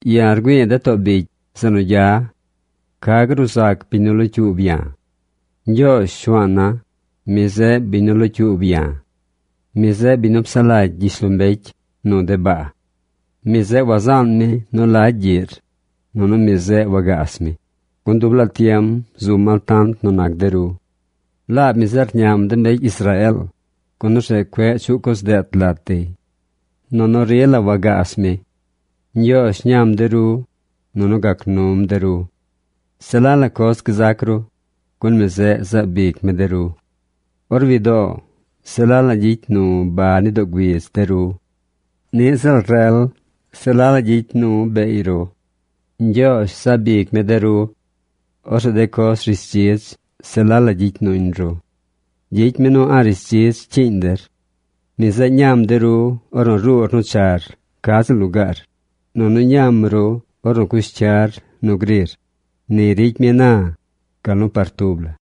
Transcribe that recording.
Ya̱ rgüi̱i̱ de too bicy zeꞌ nu gya. ¿Ca gruu zac biñ nu locyuub ya̱? Ñgyoozh, Shuaan na, mi zeꞌ biñ nu locyuub ya̱. Mi zeꞌ biñ nu psaꞌ lagy gyishlombecy nu de baa. Mi zeꞌ wazaan mi nu lagy gyiꞌr, nunu mi zeꞌ wagaas mi, gun dub laa tiem zum altant nu nac der. Laab mi zeꞌ rñam de mbecy Israeel, gun orzeꞌ cueꞌ chuꞌ coz deet lat dey. Nunu rila wagaas mi. Ñgyoozh ñam de ru, nunu gac num der. Se la la coz gzac ru, gun mi zeꞌ zaab ic mi de ru. Or widoo se la la gyicy nu ba ni doo güidz de ru. Niꞌ ziꞌl rel se la la gyicy nu beey ru. Ñgyoozh zaab ic mi de ru. Orzeꞌ de coz rishdzidz se la la gyicy nuñ ru. Gyicy mi nu a̱ꞌ rishdzidz cyiiñ der. Mi zeꞌ ñam de ru ornu ruur nu char ca ziꞌl lugaar, nunu ñam ru ornu cush cyar nu grir. Ni ricy mi na, gal nu par tub la.